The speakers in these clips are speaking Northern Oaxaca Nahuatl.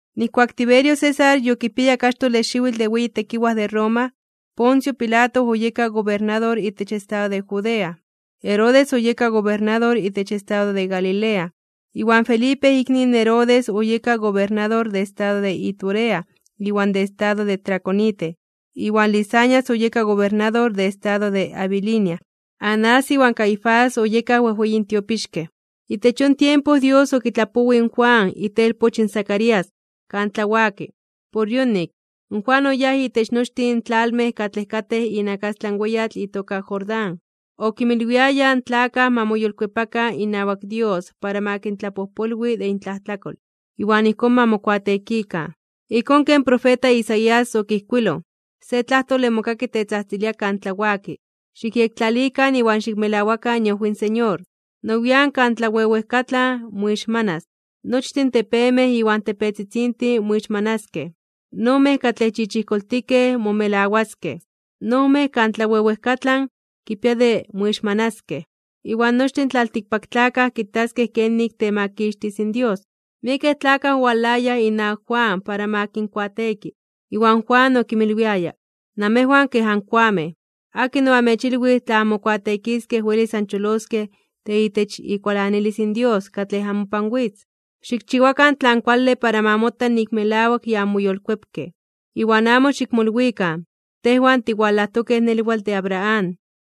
Nijkuak Tiberio César yokipiaya kaxtole xiwitl de weyi tekiwaj de Roma, Poncio Pilato oyeka gobernador itech estado de Judea, Herodes oyeka gobernador itech estado de Galilea, iwan Felipe ikni in Herodes oyeka gobernador de estado de Iturea iwan de estado de Traconite, iwan Lisanias oyeka gobernador de estado de Abilinia. Anás iwan Caifás oyekaj wejweyin tiopixkej. Itech yon tiempo Dios okitlapowij in Juan, itelpoch in Zacarías, kan tlawaki. Por yonik, in Juan oyáj itech nochtin in tlalmej katlej katej inakastlan weyatl itoka Jordán. Okinmilwiaya in tlakaj ma moyolkuepakan inawak Dios para ma kintlapojpolwi de intlajtlakol, iwan ijkón ma mokuateekikan. Ijkón ken profeta Isaías okijkuiloj: Se tlajtole mokaki tetzajtzilia kan tlawaki: “Xikyektlalikan iwan xikmelawakan iojwi in Señor. Nowian (nian nepa) kan tlawewejkatlan moixmanas, nochtin tepemej iwan tepetzitzintin moixmanaskej, in ojmej katlej chichijkoltikej momelawaskej, in ojmej kan tlawewejkatlan kipia de moixmanaskej. Iwan nochtin in tlaltikpaktlakaj kitaskej kenik temakixtis in Dios.” Miekej tlakaj owalayaj inawak Juan para ma kinkuateeki, iwan Juan okinmilwiaya: ―¡Namejwan kej ankoamej! ¿Akin oamechilwij tla anmokuateekiskej welis ancholoskej de itech ikualanilis in Dios katlej amopan witz? Xikchiwakan tlan kuale para ma mota nik melawak ya anmoyolkuepkej. Iwan amo xikmolwikan: “Tejwan tiwalajtokej nelwatl de Abraham.”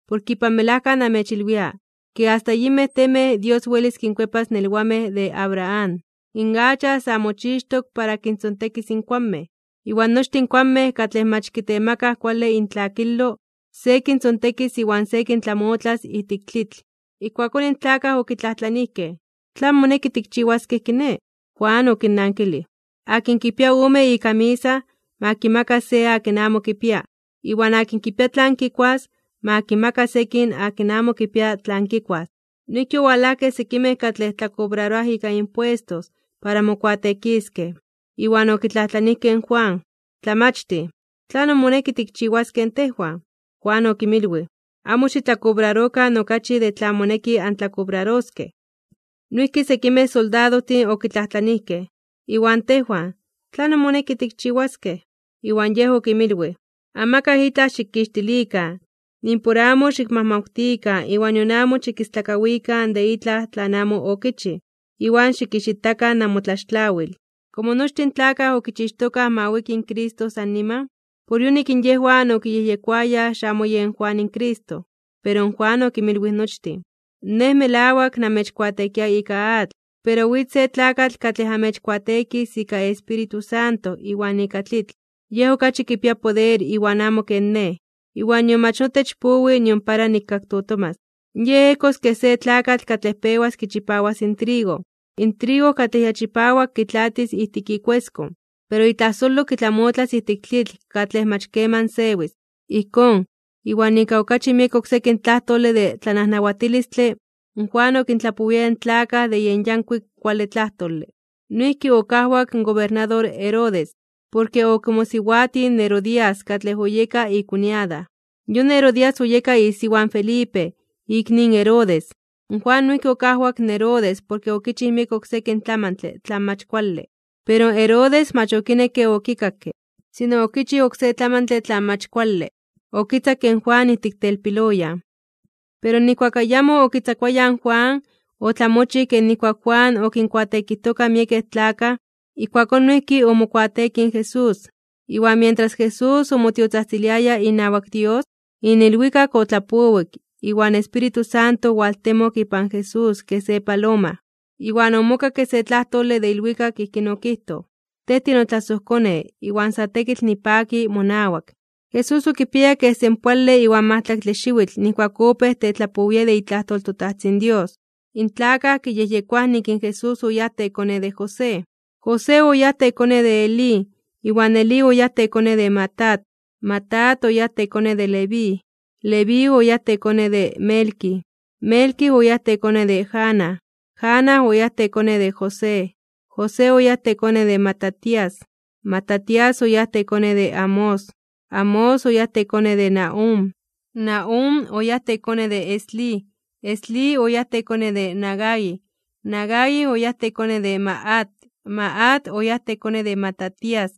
Porke ipan melajka namechilwia, ke asta yinmej temej Dios welis kinkuepas nelwamej de Abraham. In acha sa mochixtok para kintzontekis in kuanmej. Iwan nochtin in kuanmej katlej mach kitemakaj kuale intlakilo, se kintzontekis iwan se kintlamotlas ijtik tlitl. Ijkuakón in tlakaj okitlajtlanijkej: ―¿Tlan moneki tikchiwaskej kiné? Juan okinnankilij: ―Akin kipia ome ikamisa, ma kimaka se akin amo kipia. Iwan akin kipia tlan kikuas, ma kimaka sekin akin amo kipia tlan kikuas. Noijki owalajkej sekimej katlej tlakobraroaj ika impuestos para mokuateekiskej, iwan okitlajtlanijkej in Juan: ―Tlamachtij, ¿tlanon moneki tikchiwaskej in tejwan? Juan okinmilwij: ―Amo xitlakobrarokan okachi de tlan moneki antlakobraroskej. Noijki sekimej soldadojtin okitlajtlanijkej: ―Iwan tejwan, ¿tlanon moneki tikchiwaskej? Iwan yej okinmilwij: ―Amakaj itlaj xikixtilikan, nimpor amo xikmajmawtikan iwan nion amo xikistlakawikan de itlaj tlan amo okichij. Iwan xikixitakan namotlaxtlawil. Komo nochtin in tlakaj okichixtokaj ma wiki in Cristo san niman, por yonik in yejwan okiyejyekoayaj xamo yen Juan in Cristo. Pero in Juan okinmilwij nochtin: ―Nej, melawak, namechkuateekia ika atl. Pero witz se tlakatl katlej amechkuateekis ika Espíritu Santo iwan ika tlitl. Yej okachi kipia poder iwan amo ken nej, iwan nion mach notech powi nion para nikaktotomas. Yej ejkos kej se tlakatl katlej pewas kichipawas in trigo. In trigo katlej ya chipawak kitlaatis ijtik ikueskon, pero itlajsolo kitlamotlas ijtik tlitl katlej mach keman sewis. Ijkón, iwan ika okachi miek oksekin tlajtole de tlanajnawatilistle, Juan okintlapowiaya in tlakaj de yen yankuik kuale tlajtole. Noijki okajwak in gobernador Herodes, porke okimosiwatij in Herodías katlej oyeka ikuñada. Yon Herodías oyeka isiwa in Felipe, ikni in Herodes. Juan noijki okajwak in Herodes porke okichij miek oksekin tlamantle tlan mach kuale. Pero Herodes mach okinekke okikakke, sino okichij oksé tlamantle tlan mach kuale, okitzakke in Juan ijtik telpiloyan. Pero nijkuak ayamo okitzakuayaj in Juan, otlamochij ke nijkuak in Juan okinkuateekijtoka miekej tlakaj, ijkuakón noijki omokuateekij in Jesús. Iwan mientras Jesús omotiotzajtziliaya inawak Dios, in ilwikak otlapowik iwan in Espíritu Santo owaltemok ipan Jesús kej se paloma. Iwan omokakke se tlajtole de ilwikak, ijkín okijtoj: ―Tej tinotlasojKone, iwan sa tekitl nipaki monawak. Jesús okipiaya kej senpoale iwan majtlaktle xiwitl nijkuak opéj tetlapowia de itlajtol in toTajtzin Dios. In tlakaj kiyejyekoaj nik in Jesús oyáj tekone de José. José oyáj tekone de Elí, iwan Elí oyáj tekone de Matat, Matat oyáj tekone de Leví, Leví oyáj tekone de Melqui, Melqui oyáj tekone de Jana, Jana oyáj tekone de José, José oyáj tekone de Matatías, Matatías oyáj tekone de Amós, Amós oyáj tekone de Nahúm, Nahúm oyáj tekone de Eslí, Eslí oyáj tekone de Nagai, Nagai oyáj tekone de Maat, Maat oyáj tekone de Matatías,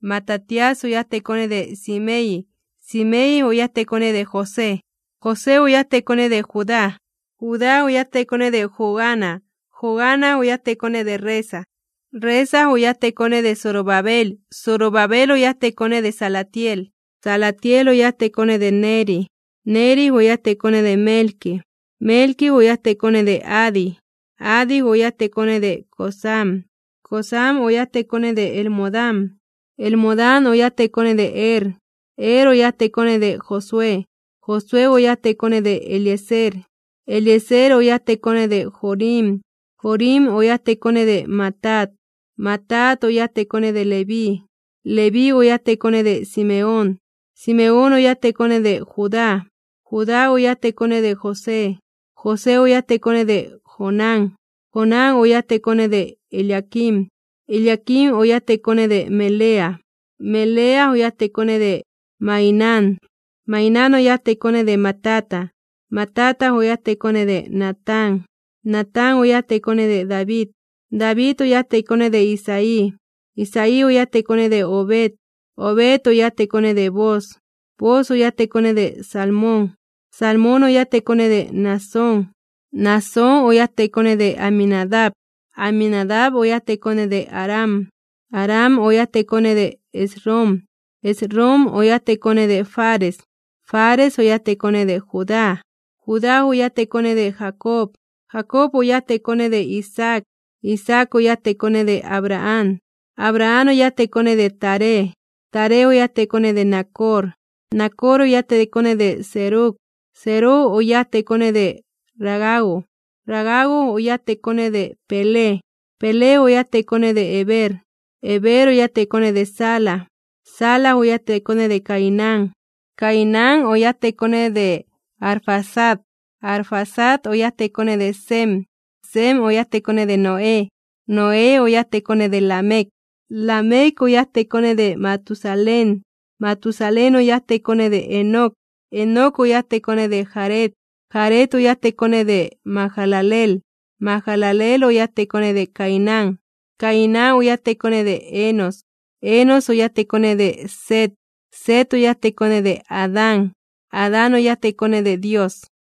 Matatías oyáj tekone de Simei, Simei oyáj tekone de José, José oyáj tekone de Judá, Judá oyáj tekone de Joana, Joana oyáj tekone de Resa, Resa oyáj tekone de Zorobabel, Zorobabel oyáj tekone de Salatiel, Salatiel oyáj tekone de Neri, Neri oyáj tekone Melqui, Melqui oyáj tekone de Adi, Adi oyáj tekone de Cosam, Cosam oyáj tekone de Elmodam, Elmodam oyáj tekone de Er, Er oyáj tekone de Josué, Josué oyáj tekone de Eliezer, Eliezer oyáj tekone de Jorim, Jorim oyáj tekone de Matat, Matat oyáj tekone de Leví, Leví oyáj tekone de Simeón, Simeón oyáj tekone de Judá, Judá oyáj tekone de José, José oyáj tekone de Jonán, Jonán oyáj tekone de Eliaquim, Eliaquim oyáj tekone de Melea, Melea oyáj tekone de Mainán, Mainán oyáj tekone de Matata, Matata oyáj tekone de Natán, Natán oyáj tekone de David, David oyáj tekone de Isaí, Isaí oyáj tekone de Obed, Obed oyáj tekone de Booz, Booz oyáj tekone de Salmón, Salmón oyáj tekone de Naasón, Naasón oyáj tekone de Aminadab, Aminadab oyáj tekone de Aram, Aram oyáj tekone de Esrom, Esrom oyáj tekone de Fares, Fares oyáj tekone de Judá, Judá oyáj tekone de Jacob, Jacob oyáj tekone de Isaac, Isaac oyáj tekone de Abraham, Abraham oyáj tekone de Taré, Taré oyáj tekone de Nacor, Nacor oyáj tekone de Serug, Serug oyáj tekone de Ragau, Ragau oyáj tekone de Peleg, Peleg oyáj tekone de Heber, Heber oyáj tekone de Sala, Sala oyáj tekone de Cainán, Cainán oyáj tekone de Arfaxad, Arfaxad oyáj tekone de Sem, Sem oyáj tekone de Noé, Noé oyáj tekone de Lamec, Lamec oyáj tekone de Matusalén, Matusalén oyáj tekone de Enoc, Enoc oyáj tekone de Jared, Jared oyáj tekone de Mahalaleel, Mahalaleel oyáj tekone de Cainán, Cainán oyáj tekone de Enos, Enos oyáj tekone de Set, Set oyáj tekone de Adán, Adán oyáj tekone de Dios.